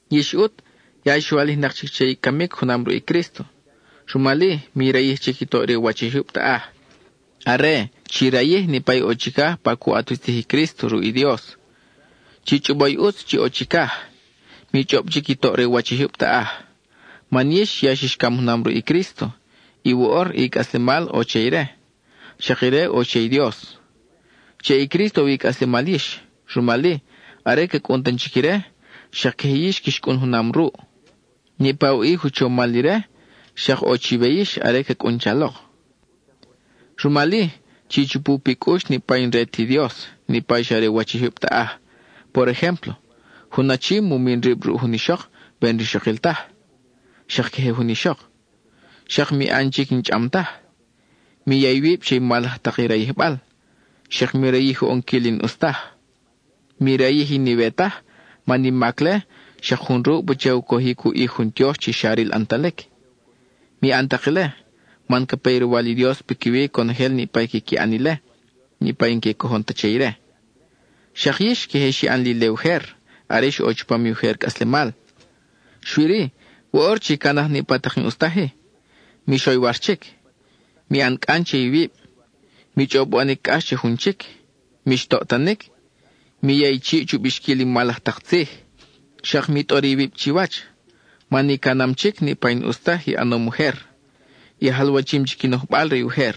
Yix ʼut, ya ix walijnak chic che i camic junam ruʼ i Crísto, rumal-i, mi rayij chic i toʼ re u wach i jyub taʼaj; are chi rayij niʼpa ʼo chicaj pa cu ʼat wi tzij i Crísto ruʼ i Dios. Chi chʼobo i ʼutz chi ʼo chicaj, mi chʼob chic i toʼ re u wach i jyub taʼaj. Man yix ya xix cam junam ruʼ i Crísto, y woʼor i cʼaslemal ʼo che ire, xak ire ʼo che i Dios. Che i Crísto ʼo wi i cʼaslemal yix, rumal-i, are ca cʼun tan chic ire, xak queje yix quix cʼun junam ruʼ. Niʼpa i u ʼij u chomal ire, xak ʼo chiwe yix are ca cʼun chalok. Rumal-i, chi chupu pi cʼux niʼpa i n-re ti Dios, niʼpa i xa re u wach i jyub taʼaj; por ejémplo: jun achi mu min rib ruʼ jun ixok we n-rixokil taj, xak queje jun ixok; xak mi ʼan chic i n-chʼam taj; mi ya iwib che i mal laj tak i rayijbal, xak mi rayij u ʼonquil i n-ʼus taj. Mi rayij i n-iwe taj man i mac-le xak jun ruʼ pacha u cojic u ʼij jun tiox chi xa ril ʼantalic. Mi ʼan tak ile, man ca pe i roywal i Dios piquiwi conojel niʼpa i quiqui ʼan ile, niʼpa i n-que cojon ta che ire. Xak yix queje xi ʼan li ile ujer, are ix ʼo chupam i ujer cʼaslemal. Xui-ri, woʼor chi canaj niʼpa tak i n-ʼus taj-i: mix oywar chic, mi ʼan cʼan che iwib, mi chʼob u ʼanic cʼax che jun chic, mix toʼtanic, mi ya i chiʼ chu bixquil i mal laj tak tzij. Xak mi tʼor iwib chiwach, man i canam chic niʼpa i n-ʼus taj i ʼanom ujer; i jalwachim chic i nojbal re ujer.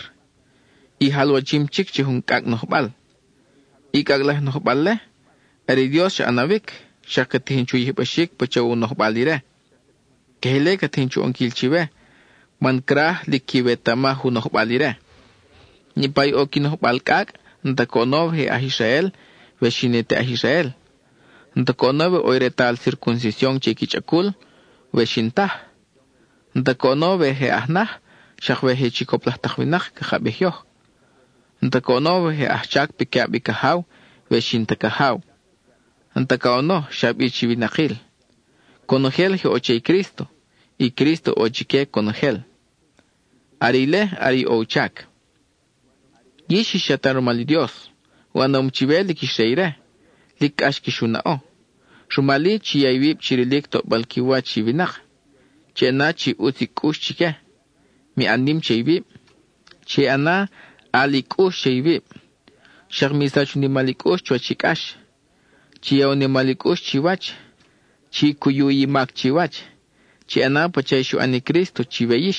I jalwachim chic che jun cʼacʼ nojbal. I cʼacʼ laj i nojbal-le, are i Dios xa ʼanawic, xak ca tijin chu yijbaxic pacha u nojbal ire. Queje ile ca tijin chu ʼonquil chiwe, man craj lic quiwetamaj u nojbal ire. Niʼpa i ʼo qui nojbal cʼacʼ, n-ta coʼono we je aj Israel, we xi ne te aj Israel; n-ta coʼono we ʼo i retal circuncision che qui chʼacul, we xi n-taj; n-ta coʼono we je aj naj, xak we je chicop laj tak winak caka bij yoj; n-ta coʼono we je ajchac piquiʼab i cajaw, we xi n-ta cajaw. (N-ta coʼono xa bi chi winakil.) Conojel je ʼo che i Crísto, y Crísto ʼo chique conojel; are ile are i ʼo u chac. Yix ix chatal rumal i Dios; u ʼanom chiwe lic ix re ire; lic cʼax quix u naʼo. Rumal-i, chi ya iwib chi rilic toʼbal qui wach i winak, chi ʼana chi ʼutz i cʼux chique, mi ʼan nim che iwib, chi ʼana ʼal i cʼux che iwib, xak mi sach u nimal i cʼux chuwach i cʼax. Chi ya u nimal i cʼux chiwach; chi cuyu i mac chiwach; chi ʼana pacha i xu ʼan i Crísto chiwe yix,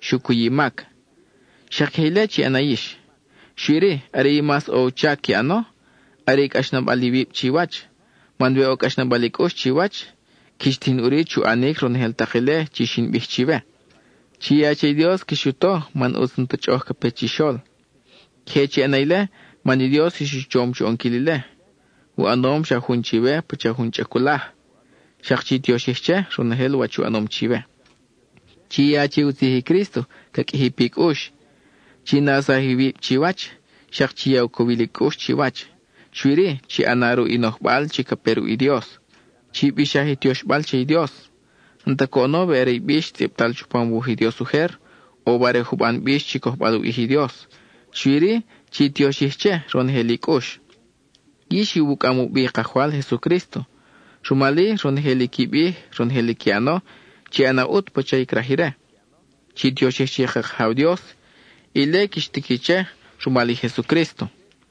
xu cuy i mac; xak queje ile chi ʼana yix. Xui-ri, are i mas ʼo u chac qui ʼano, are i cʼaxnabal iwib chiwach, man we ʼo cʼaxnabal i cʼux chiwach, quix tijin ʼuri chu ʼanic ronojel tak ile chi xin bij chiwe. Chi ya che i Dios quix u to man ʼutz n-ta chʼoʼoj ca pe chixol. Queje chi ʼana ile man i Dios ix u chom chu ʼonquil ile; u ʼanom xa jun chiwe pacha jun chʼaculaj. Xak chi tioxij che, ronojel wach u ʼanom chiwe. Chi ya che i u tzij i Crísto ca qʼuiji pi cʼux. Chi nawsaj iwib chiwach, xak chi ya u cowil i cʼux chiwach, xui-ri, chi ʼana ruʼ i nojbal chi ca pe ruʼ i Dios. Chi bixaj i tioxbal che i Dios, n-ta coʼono we are i bix tzʼibtal chupam u wuj i Dios ujer, o we are juban bix chi cojbal u ʼij i Dios; xui-ri, chi tioxij che, ronojel i cʼux. Yix iwucʼam u bi i Kajwal Jesucrísto, rumal-i, ronojel i qui bij, ronojel i qui ʼano, chi ʼana ʼut pacha i craj ire. Chi tioxij che i ka Kajaw Dios; ile quix tiqui che rumal i Jesucrísto.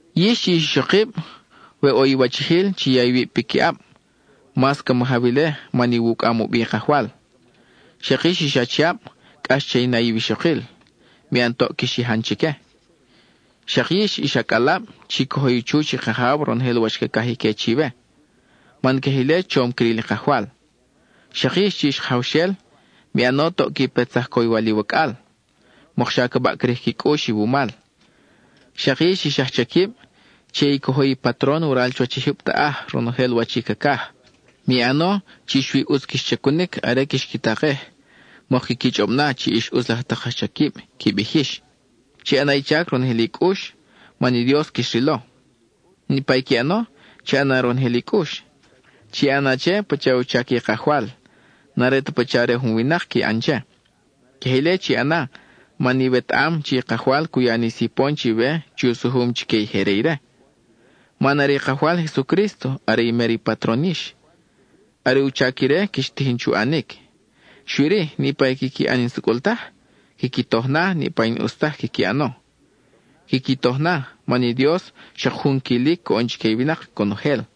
Yix chi ix ixokib, we ʼo iwachijil, chi ya iwib piquiʼab; mas ca majaw ile man iwucʼam u bi i Kajwal. Xak yix ix achiab, cʼax che i na iwixokil; mi ʼan toʼ quix yajan chique. Xak yix ix acʼalab, chi cojo i chuch i kajaw ronojel wach cacaj ique chiwe, man queje ile chom cril i Kajwal. Xak yix chi ix kajawxel, mi ʼan toʼ qui petsaj coywal iwacʼal, mokxa ca baʼcrij qui cʼux iwumal. Xak yix ix ajchaquib, che i cojo i patron waral chuwach i jyub taʼaj ronojel wach i cacaj. Mi ʼano chi xui ʼutz quix chacunic are quix qui takej mok quiqui chʼob na chi ix ʼutz laj tak ajchaquib (qui bij yix). Chi ʼana i chac ronojel i cʼux, man i Dios quix rilo. Niʼpa i qui ʼano, chi ʼana ronojel i cʼux. Chi ʼana che pacha u chac i Kajwal; n-are ta pacha re jun winak qui ʼan che. Queje ile chi ʼana man iwetaʼam chi i Kajwal cu ya ni sipon chiwe chi u sujum chique i je re ire. Man are i Kajwal Jesucrísto are i mer i patron yix; are u chac ire quix tijin chu ʼanic. Xui-ri, niʼpa i quiqui ʼan i n-sucʼul taj, quiqui toj na niʼpa i n-ʼus taj quiqui ʼano. Quiqui toj na, man i Dios xak jun quilic coʼon chique i winak conojel.